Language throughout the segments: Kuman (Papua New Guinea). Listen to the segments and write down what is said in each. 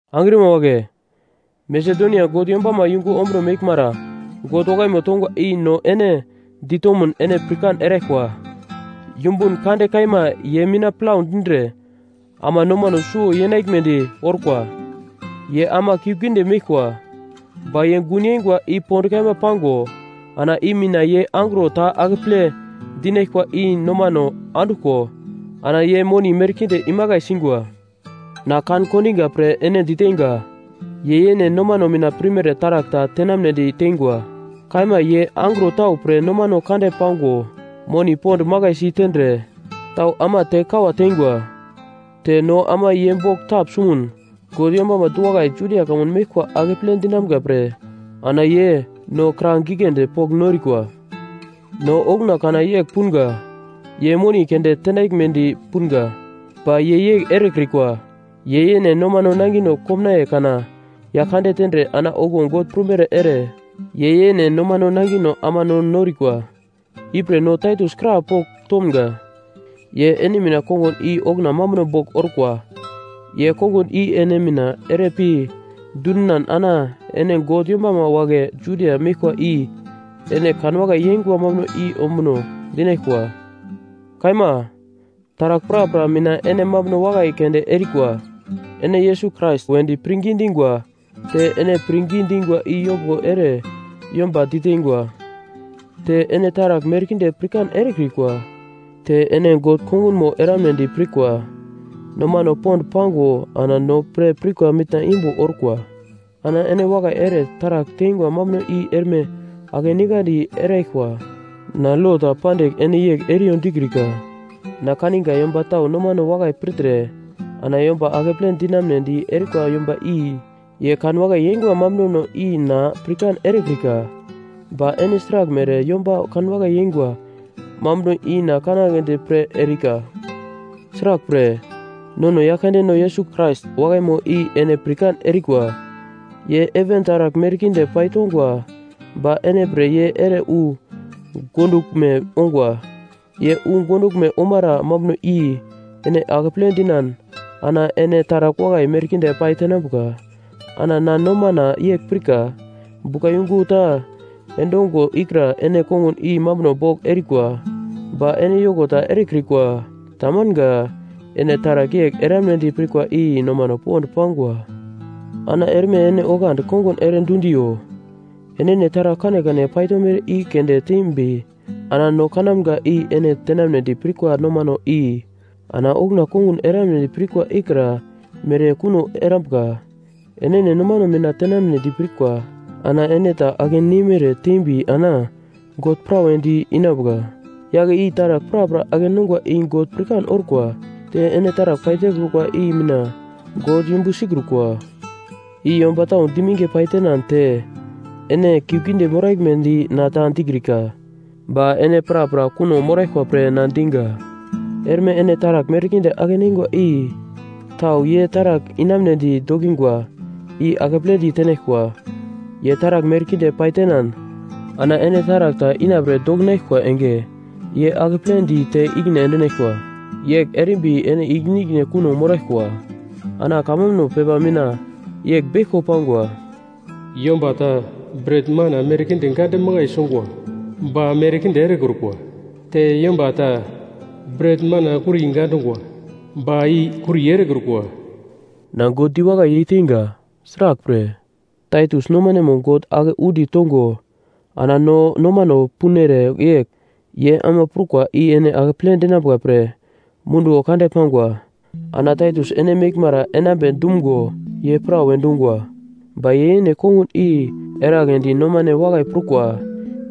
Angrima wagle, Masedonia God yombama yungu ombuno meglmara God wakaimo tongwa i no ene ditomun ene pirkan eraglkwa. Yumbun kande kaima ye mina plau dindre ama nomano suwo yenaglmedi orkwa. Ye ama kiuglgiunde meglkwa. Ba ye gun yeingwa i pond kaima pango ana i mina ye angro ta akeple dinaglkwa i nomano anduglko ana ye moni merkinde imakai singwa. Na kan-kondiga pre ene diteinga, ye yene nomano mina pirmere taragl ta tenamnedi teingwa. Kaima ye angro tau pre nomano kande pango moni pond makai si tendre tau ama te kawa teingwa. Te no ama ye bogl tapsumun God yombama du-wakai Judia kamun meglkwa akeple dinamga pre ana ye no kra giglendi pogl norikwa. No okuna kana yegl punga ye moni keunde tenaglmedi punga. Ba ye yegl erekrikwa. Ye yene nomano nangino komnaiye kana Yaglkande tendre ana okuwo God prumere ere ye yene nomano nangino ama no norikwa. Ipre no Taitus krapogl tomga, ye ene mina kongun i okuna mambuno bogl orkwa. Ye kongun i ene mina ere pi dundinan ana ene God yombama wagle Judia meglkwa i ene kanwakai yeingwa mambuno i ombuno dinaglkwa. Kaima, taragl prapra mina ene mambuno wakai keunde erikwa. Ene Yesus Krais wedi pirngi dingwa, te ene pirngi dingwa i yombuglo ere yomba diteingwa, te ene taragl merkinde pirkan erikwa. Te ene God kongunmo eramnedi pirkwa nomano pond pango ana no pre pirkwa mitna imbo orkwa. Ana ene wakai ere taragl teingwa mambuno i erme akeningandi eraglkwa. Na lo ta pandigl ene yegl eriyo dikrika. Na kaninga yomba tau nomano wakai pirtre ana yomba akeple dinamunedi erikwa yomba i ye kanwakai yeingwa mambunono i na pirkan erekrika. Ba ene sraglmere yomba kanwakai yeingwa mambuno i na kanagledi pre erika. Sraglpre, nono Yaglkandeno Yesus Krais wakaimo i ene pirkan erikwa. Ye heven taragl merkinde paitongwa ba ene pre ye ere wu gonduglme ongwa. Ye wu gonduglme omara mambuno i ene akeple dinan ana ene taragl wakai merkinde pai tenambuka. Ana na nomana yegl pirka, buglayungu ta endongwa ikra ene kongun i mambuno bogl erikwa, ba ene yoko ta erekrikwa. Tamanga. Ene taragl yegl eramunedi prikwa i nomano pond pangwa. Ana erme ene oglandi kongun ere dundiyo. Enene taragl kanekane paitomere i keunde tembi ana no kanamga i ene tenamnedi prikwa nomano i ana okuna kongun eramunedi pirkwa ikra mere kuno erambuka. Enene nomano mina tenamnedi pirkwa ana ene ta ake neimere teimbi ana God prawedi inambuka. Yagle i taragl prapra ake-nongwa i God pirkan orkwa. Te ene taragl paitekrukwa i mina God yumbu sikrukwa. I yomba tau diminge paitenan te ene kiuglgiunde moraglmedi na ta dikrika. Ba ene prapra kuno moraglkwa pre na diga. Erme ene taragl merkinde ake-neingwa i tau ye taragl inamunedi dokingwa i akepledi tenaglkwa. Ye taragl merkinde paitenan ana ene taragl ta inapre dokinaglkwa enge ye akepledi te ikine endinaglkwa. Yegl erimbi ene ikine-ikine kuno moraglkwa. Ana kamambuno pepa mina yegl beglko pangwa: “Yomba ta bret-mana merkinde gande makai sungwa, ba merkinde erekrukwa. Te yomba ta bret-mana kuri gandungwa, ba i kuri erekrukwa.” Na God diwakai yeiteinga. Sraglpre, Taitus nomanemo God ake undi tongo ana no nomano punere yegl ye ama prukwa i ene akeple dinambuka pre munduwo kande pangwa. Ana Taitus ene meglmara enambe dumgo ye prawe dungwa. Ba ye yene kongun i eragledi nomane wakai prukwa.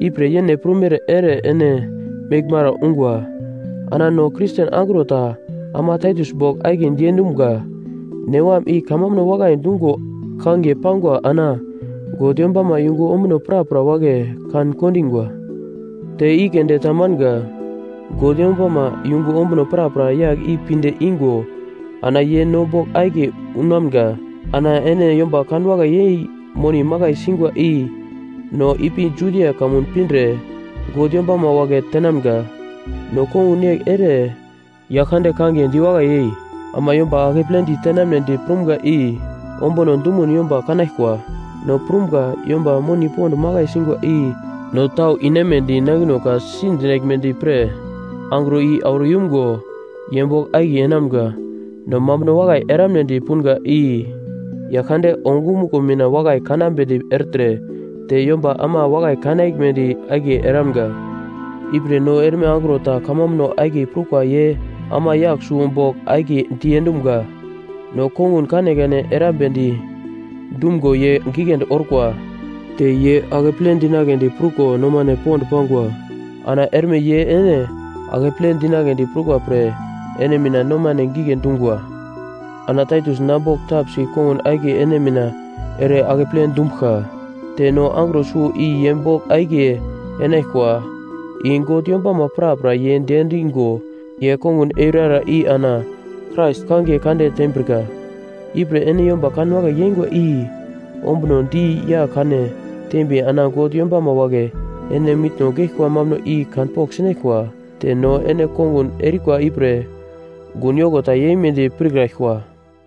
Ipre yene prumere ere ene meglmara ungwa. Ana no Kristen angro ta ama Taitus bogl akiye diendumga. Newam i kamambuno wakai dungo kangiye pago ana God yombama yungu ombuno prapra wagle kan-kondingwa. Te i keunde ta manga, God yombama yungu ombuno prapra yagl i pinde ingo ana ye no bogl akiye unamga. Ana ene yomba kanwakai yei moni makai singwa i no ipi Judia kamun pindre God yombama wagle tenamga. No kongun yegl ere Yaglkande kangiye diwakai yei ama yomba akepledi tenamnedi prumga i ombuno dumun yomba kanaglkwa. No prumga yomba moni pond makai singwa i no tau inemedi nangino ka-si dinaglmedi pre angro i auro yumgo ye bogl akiye enamga. No mambuno wakai eramunedi punga i Yaglkande ongumuglo mina wakai kanambedi ertre, te yomba ama wakai kanaglmedi akiye eramga. Ipre no erme angro ta kamambuno akiye prukwa ye ama yagl suwo bogl akiye diendumga. No kongun kanekane erambedi dumgo ye giglendi orkwa, te ye akeple dinagledi pruko nomane pond pangwa. Ana erme ye ene akeple dinagledi prukwa pre ene mina nomane gigle dungwa. Ana Taitus na bogl tapsi kongun akiye ene mina ere akeple dumbuglka. Te no angro suwo i ye bogl akiye enaglkwa. I God yombama prapra ye diendingo ye kongun eurara i ana Krais kangiye kande tembrika. Ipre ene yomba kanwakai yeingwa i ombunodi yagl-kane tembi ana God yombama wagle ene mitno geglkwa mambuno i kanpogl sinaglkwa, te no ene kongun erikwa ipre gun yoko ta yeimedi pirkraglkwa.